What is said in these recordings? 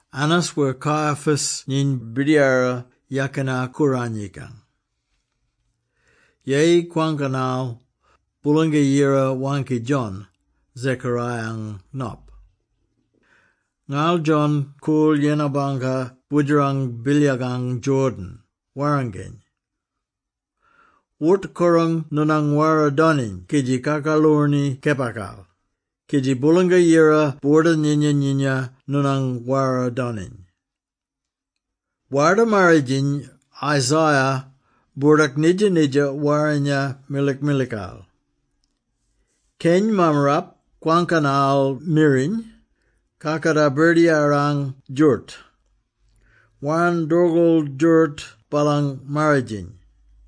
Annas wer Caiaphas nyiny Birdiyara Yakina-Kooranyikang. Yeyi kwangkanal, Boolanga-Yira waangki John, Zechariah-ang nop. Ngarl John koorl yennar bangka boodjerang bilyakang Jordan, warranginy: “Wort-korang noonang wara-doniny kidji kakaloorni kepakal, kidji Boolanga-Yira boorda-nyinya-nyinya noonang wara-doniny. Warda-Marridjiny Isaiah boordak nidja-nidja warrinya milikmilikal: ‘Keny mammarap kwangkanal miriny, “Kakatar Birdiyarang djooroot! Warn doorgool djooroot baalang marridjiny!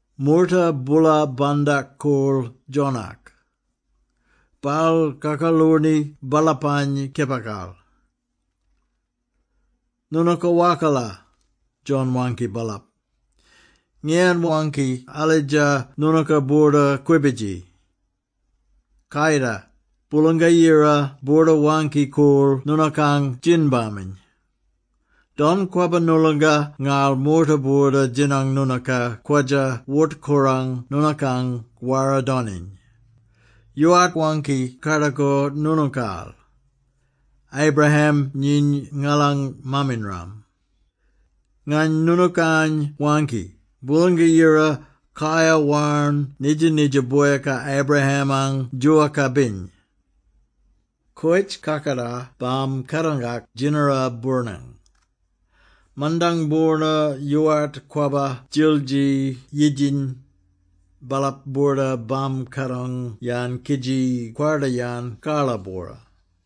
Moorta boola bandak-koorl John-ak. Baal kakaloorni baalapany kepakal. “Noonooka wakala!” John waangki baalap, “Ngiyan waangki alidja noonooka boorda-kwibidji? Kayida, Boolanga-Yira boorda-waangki-koorl noonookang djin-baminy! Don kwabba noolonga ngarl moorta boorda djinang noonooka kwadja wort-korang noonookang wara-doniny. Yoowart waangki kardakor noonookaal, ‘Abraham nyiny ngalang maam-inram’. Ngany noonookany waangki, Boolanga-Yira kayar warn nidja-nidja boyaka Abraham-ang djoowaka-biny. Koyitj kakatar bam-kadongak djinnara boornang. Mandang boorna yoowart kwabba djildji yidjiny, baalap boorda bam-kadong-yan kidji kwarda-yan karla-bwora.”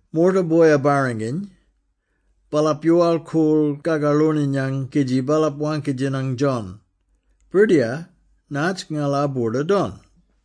Moorta boya-barranginy, baalap yoowal-koorl kakaloorninyang kidji baalap waangki-djinang John, “Birdiyar, natj ngala boorda don?”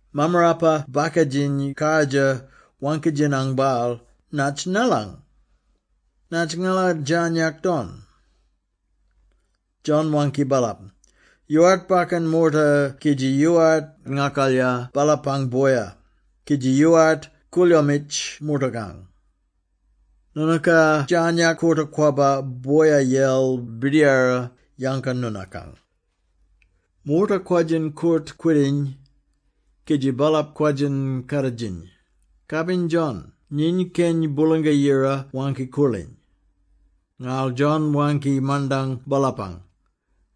Mammarapa-bakadjiny kardjir waangki-djinang baal, “Natj ngalang? Natj ngala djarnyak don?” John waangki baalap, “Yoowart bakkan moorta kidji yoowart ngakalya baalapang boya, kidji yoowart koolyoomitj moortakang. Noonooka djarnyak koota-kwabba boya-yel birdiyara yanga noonookany.” Moorta kwadjin koort-kwidiny, kidji baalap kwadjin kaaditjiny, “Kabin John nyiny Keny Boolanga-Yira Waangki-Koorliny!” Ngarl John waangki mandang baalapany,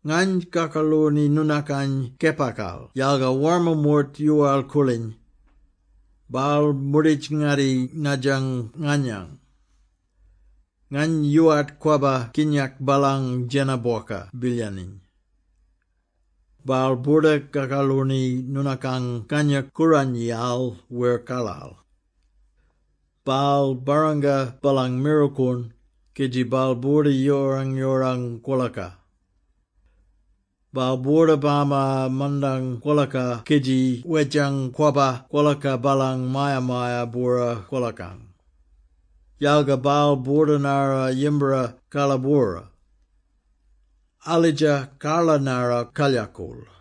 “Ngany kakaloorni noonookany kepakal yalga warma moort yoowal-koorliny. Baal moorditj-ngatti nadjang nganyany. Ngany yoowart kwabba kinyak baalang djena-bwoka bilyaniny. Baal boorda-kakaloorni noonookany Kangya-Kooranyiyal wer karlal. Baal barranga baalang mirlkoon kidji baal boorda yoorang-yoorang kwolaka. Baal boorda bama mandang kwolaka kidji wedjang kwabba kwolaka baalang maya-maya-bwora kwolakang. Yalga baal boorda-narra yimbara karla-bwora. Alidja karla narra kalyakool.”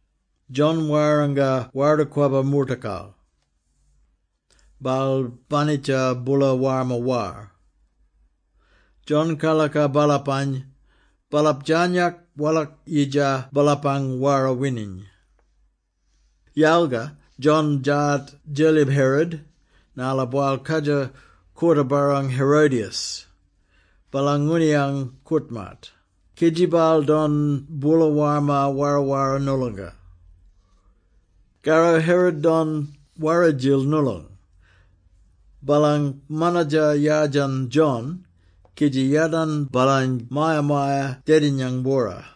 John warranga Warda-Kwabba moortakal. Baal banitja boola warma war. John karlaka baalapany, baalap djarnyak walak-yidja baalapang wara-wining. Yalga John djaat Djelyib Herod, narla baal kwadja koorta-barrang Herodias, baalang ngooniyang koort-maat, kidji baal don boola warma wara-wara noolonga. Karro Herod don wara-djil noolong: baalang manatja yardjan John kidji yadarn baalany maya-maya dedinyang-bwora.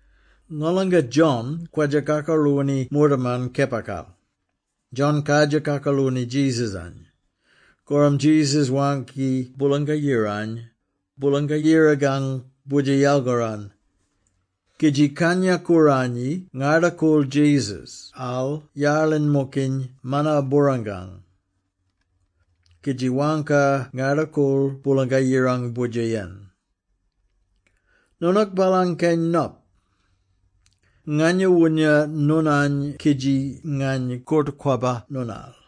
Ngolanga John kwadja kakaloorni moortaman kepakal, John kadjir kakaloorni Jesus-any. Korram Jesus waangki Boolanga-Yirany, Boolang Yirakang Boodjer yalgaran, kidji Kangya-Kooranyi ngarda-koorl Jesus-al yarlin-mokiny mana-boorangkang. Kidji waangka ngarda-koorl Boolanga-Yirang Boodjer-yen, “Noonook baalang keny Nop. Nganya woonya noonany kidji ngany koort-kwabba noonal!”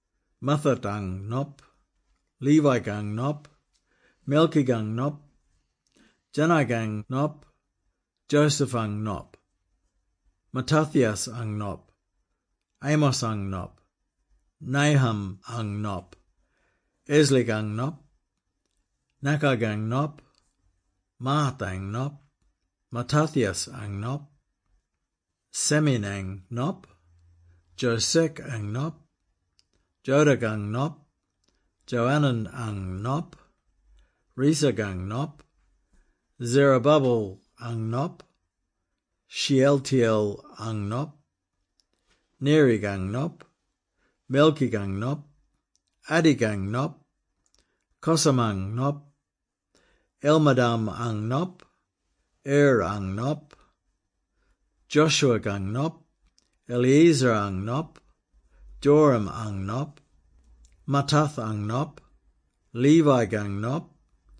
Matthat-ang nop, Levi-kang nop, Melchi-kang nop, Jannai-kang nop, Joseph-ang nop, Mattathias-ang nop, Amos-ang nop, Nahum-ang nop, Esli-kang nop, Nakgai-kang nop, Maath-ang nop, Mattathias-ang nop, Semein-ang nop, Josech-ang nop, Joda-kang nop, Joanan-ang nop, Rhesa-kang nop, Zerubbabel-ang nop, Shealtiel-ang nop, Neri-kang nop, Melchi-kang nop, Addi-kang nop, Cosam-ang nop, Elmadam-ang nop, Er-ang nop, Joshua-kang nop, Eliezer-ang nop, Jorim-ang nop, Mattath-ang nop, Levi-kang nop,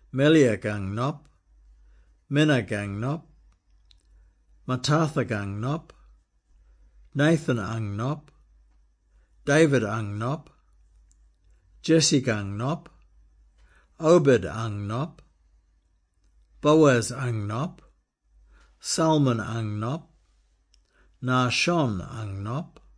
Melea-kang nop, Menna-kang nop, Mattatha-kang nop, Nathan-ang nop, David-ang nop, Jesse-kang nop, Obed-ang nop, Boaz-ang nop, Salmon-ang nop, Nahshon-ang nop,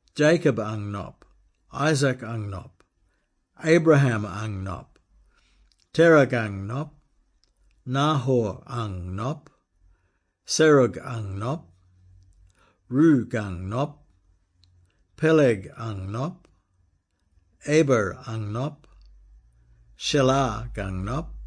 Jacob-ang nop, Isaac-ang nop, Abraham-ang nop, Terah-kang nop, Nahor-ang nop, Serug-ang nop, Reu-kang nop, Peleg-ang nop, Eber-ang nop, Shelah-kang nop,